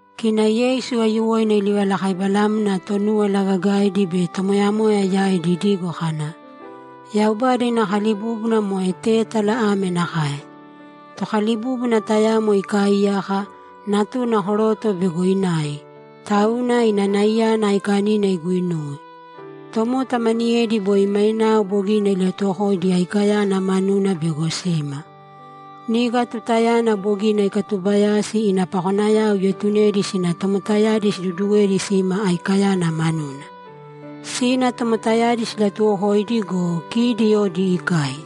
Kina Yeisu aiyuwoina ilivalakaibalamna Tonúwala Gagaidi be tomoyamoya yaidi idigo kana, ‘Yaubada ina kalibúbuna moe tétala ame nakae: Tokalibúbuna tayamo ikaaiyaka, natuna koroto bego inai, tauna ina naiyana aikanina iguinuwe. Tomota maniyedi boi mainao bogina ilatuwokoidi aikayana manuna bego sima. Niga tutayana bogina ikatubayasi ina pakonayao ietunedi sina tomotayadi siduduwedi sima aikayana manuna. Sina tomotayadi silatuwokoidi go, kidi odi ikai.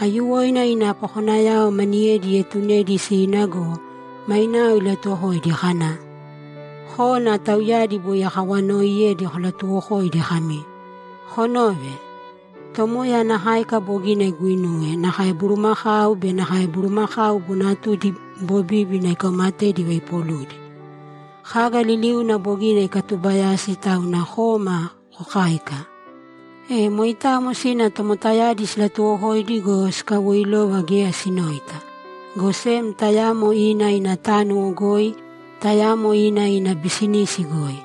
Aiyuwoina ina pakonayao maniyedi ietunedi sina go, mainao ilatuwokoidi kana, “Kōna tauyadi boi akawanooiyedi kolatuwokōidi kami, ‘Konōve! Tomoya ana káika bogina iguinuwe, nakae bulumakau be nakae bulumakau bonatudi bobíbina ikaumatedi ivaipoludi. Kaga liliuna bogina ikatubayasi, tauna kōma kokāika.’” E moitamo sina tomotayadi silatuwokoidi go, sikawoilova geya sinoita, go sem tayamo ina ina tánuwo goi, tayamo ina ina bisinis goi.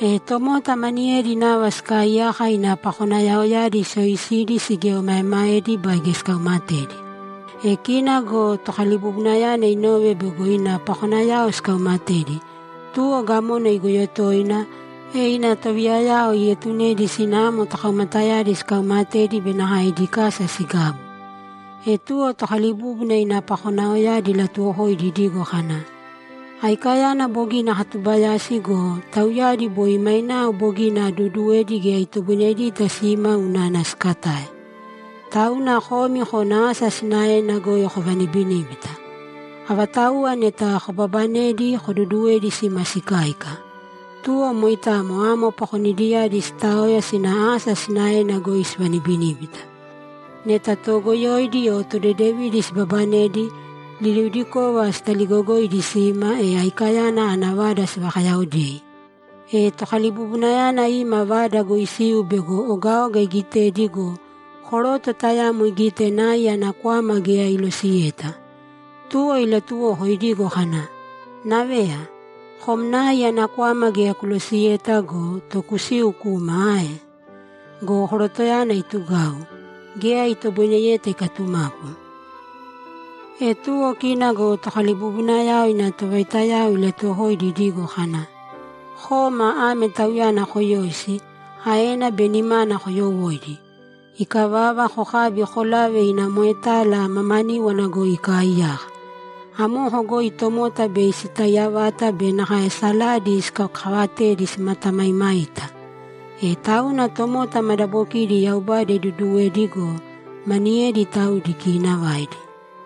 E tomota maniyedi nava sikaaiyaka ina pakonayaoyadi siyoisidi sigieomaemaedi baige sikaumatedi. E kina go tokalibubunayana inove bego ina pakonayao sikaumatedi, tuwo gamona igoyo toina, e ina tovayaviyayao ietunedi sina amo tokaumatayadi sikaumatedi be nakae idi kasa sigabu. E tuwo tokalibúbuna ina pakonayaoyadi ilatuwokoidi idigo kana, “Aikayana bogina akatubayasi go, tauyadi boi mainao bogina aduuduwedi geya itoboinedita sima unana sikatae. Tauna komi kōna asa sinaena goi kovanibinībita. Avatauwa neta kobabanedi, koduduwēdi sima sikáika.” Tuwo moitamo amo pakonidiyadi sitaoya sina asa sinaena goi sivanibiníbita. Neta toogoyoidi o todedevidi sibabanedi, liliudikova sitaligogoidi sima, e aikayana ana vada sivakayaodei. E tokalibubunayana ima vada goi isiu bego ogaoga igitedi go, koroto tayamo igite nai ana kwama geya ilosiyeta. Tuwo ilatuwoko idigo kana, “Naveya, kom nai ana kwama geya kulosiyeta go, to kusiu kuma ae?” Go korotoyana itugau; geya itoboineyeta ikatumapu. E tuwo kina go tokalibubunayana ina tovaitayao ilatuwokoidi idigo kana, “Kōma ame tauyana koyōisi, aena be nimana koyowōidi. Ikavava, kokābi kolāve ina moetala mamaníwana goi ikaaiyaka. Amoko goi tomota bei sitaiya vata be nakae saladi sikakaavatedi simatamaimaita.” E tauna tomota madabokidi Yaubada iduduwedi go, maniyedi taudi kiinavaidi.’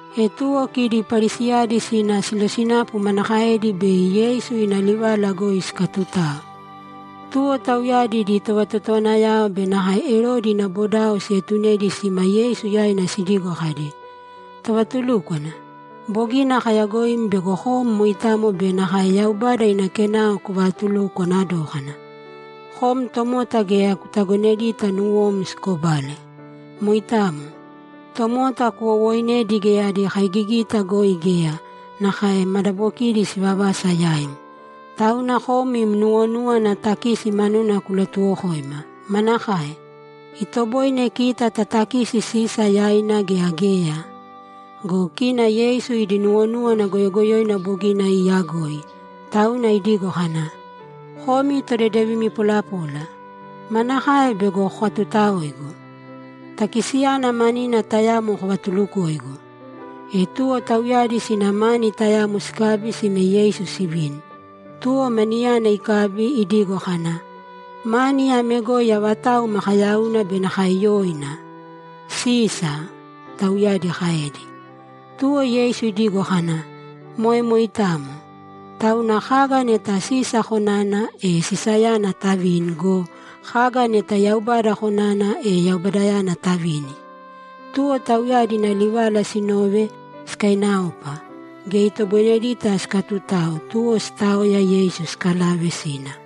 E tuwo kidi Parisiyadi sina silosinapu manakaedi bei Yeisu ina livala goi sikatutao. Tuwo tauyadi idi tovatotowanayao be nakae Erodi ina bodao sietunedi sima Yeisu yaina sidigo kadi, ‘Tovatulúkwana, bogina kayagoim bego kom moitamo be nakae Yaubada ina kenao kuvatulukwana dókana. Kom tomota geya kutagonedita nuwom sikobale. Moitamo. Tomota kuwowooinedi geya adi kaigigita goi geya; nakae madabokidi sivavasa yaim. Tauna kom im nuwonúwana takisi manuna kulatuwokōima. Manakae? Itoboine kita tatakisi Sisa yaina gea geya?’ Go kina Yeisu idi nuwonúwana goyogoyoina bogina iiyagoi, tauna idigo kana, ‘Komi todedevimi polapola, manakae bego kokatutaoigu? Takisiyana manina tayamo kovatulukōigu.’ E tuwo tauyadi sina mani tayamo sikabi sime Yeisu sivini. Tuwo maniyana ikabi, idigo kana, ‘Mani ame goi avatau makayauna be nakae yoina?’ ‘Sisa!’ Tauyadi kaedi. Tuwo Yeisu idigo kana, ‘Moe moitamo. Tauna kaga neta Sisa konana, e Sisayana tavīni go, kaga neta Yaubada konana, e Yaubadayana tavīni.’ Tuwo tauyadi ina livala sinove, sikainaopa. Geya itoboinedita sikatutao, tuwo sitaoya, Yeisu sikalave sina.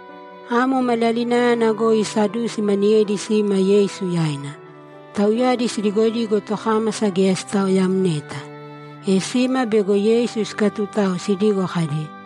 Amo maliyalinayana goi Sadusi maniyedi sima Yeisu yaina. Tauyadi sidigodigo tokámasa geya sitaoyamneta. E sima bego Yeisu sikatutao sidigo kadi,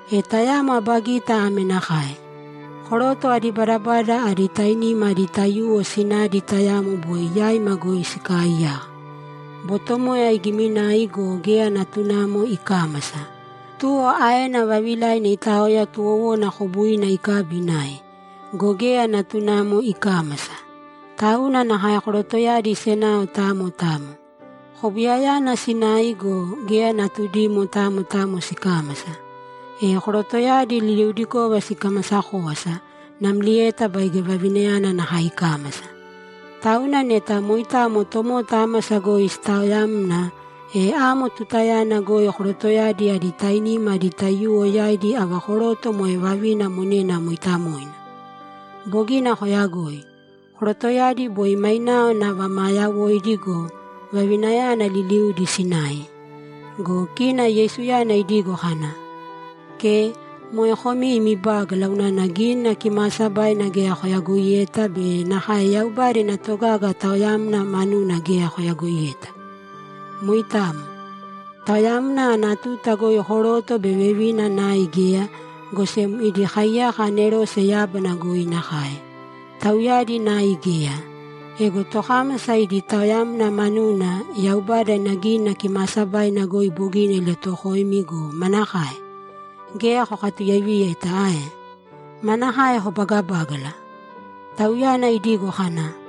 E tayamo aba gita ame nakae: Koroto adi badabada adi tainima adi taiyuwo sinadi tayamo boi yaima goi sikaaiyaka. Botomoya igiminai go, geya natunamo ikámasa. Tuwo aena vavilaina itaoya tuwowona kobuina ikabi inai. Go geya natunamo ikámasa. Tauna nakae korotoyadi senao tamo tamo. Kobuyayana sinai go, geya natudimo tamo tamo sikámasa. E korotoyadi liliudikova sikamasa kówasa, namlieta baige vavinayana nakae ikámasa. Tauna neta moitamo tomota ámasa goi sitaoyamna, e amo tutayana goi korotoyadi adi tainima adi taiyuwo yaidi ava koroto moe vavina monena mooitamoina? Bogina koyagoi. Korotoyadi boi mainao nava maa yawoidi go, vavinayana liliudi sinai.’ Go kina Yeisuyana idigo kana, ‘Ke, moe komi imi bágala unana Gínina Kimaasabaina geya koyagoiyeta be nakae Yaubada ina togaga taoyamna manuna geya koyagoiyeta. Moitamo. Taoyamna ana tuta goi koroto be vevina nai geya, go sem idi kaiyaka anerose yábana goi nakae; tauyadi nai geya. Ego tokámasa idi taoyamna manuna, Yaubada ina Gínina Kimaasabaina goi bogina ilatuwokoimi go, manakae? Geya kokatuyaiviyeta ae? Manakae kobagabágala? Tauyana idigo kana,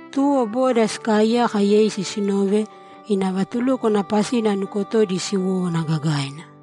Tuwo boda sikaaiyaka Yeisu sinove, ina vatulúkwana pasina nukotodi siwowówana gagaina.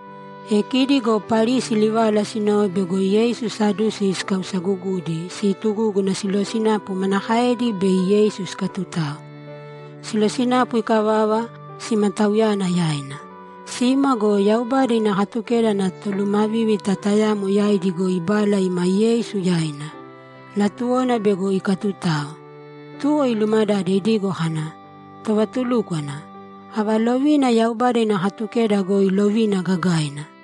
E kidi go Parisi livala sinove bego Yeisu Sadusi ikausagugudi, situgúguna silosinapu manakaedi bei Yeisu sikatutao. Silosinapu ikavava, sima Tauyana yaina. Sima go, Yaubada ina Katukeda ana tolumavívita tayamo yaidi goi ibala ima Yeisu yaina; latuwona bego ikatutao. Tuwo ilumadade idigo kana, ‘Tovatulúkwana, ava lovina Yaubada ina Katukeda goi lovina gagaina?’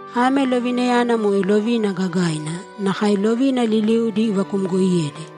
Ame lovinayana moe lovina gagaina, nakae lovina liliudi ivakumgoiyedi.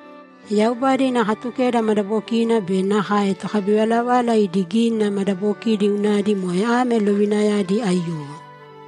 Yaubada ina Katukeda madabokina be nakae tokabivalavala idi gínina madabokidi unadi moe ame lovinayadi aiyuwo.’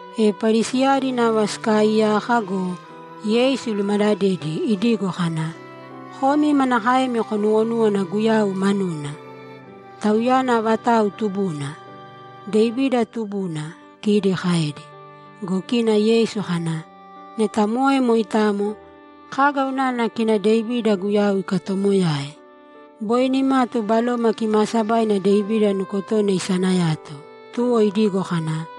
E Parisiyadi nava sikaaiyaka go, Yeisu ilumadadedi idigo kana, ‘Komi manakaemi konuwonúwana Guyau manuna? Tauyana avatau tubuna?’ ‘Devida tubuna’, kidi kaedi. Go kina Yeisu kana, ‘Neta moe moitamo, kaga unana kina Devida Guyau ikatomoyae? Boi nimatu Baloma Kimaasabaina Devida nukotona isanayato, tuwo idigo kana,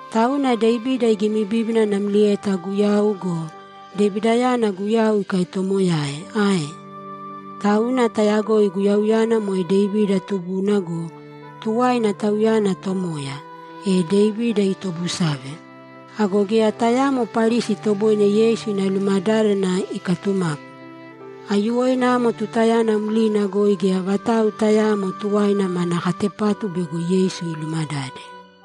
Tauna Devida igimibíbina namlieta Guyau go, Devidayana Guyau ikatoomoyae ae? Tauna tayagoi Guyauyana moe Devida tubuna go, tuwaina, Tauyana Tomoya, e Devida itobusave!’ Ago geya tayamo Parisi itoboine Yeisu ina lumadádana ikatumapu. Aiyuwoina amo tutayana mlina goi geya vatau tayaamo tuwaina mana katepatu bego Yeisu ilumadade.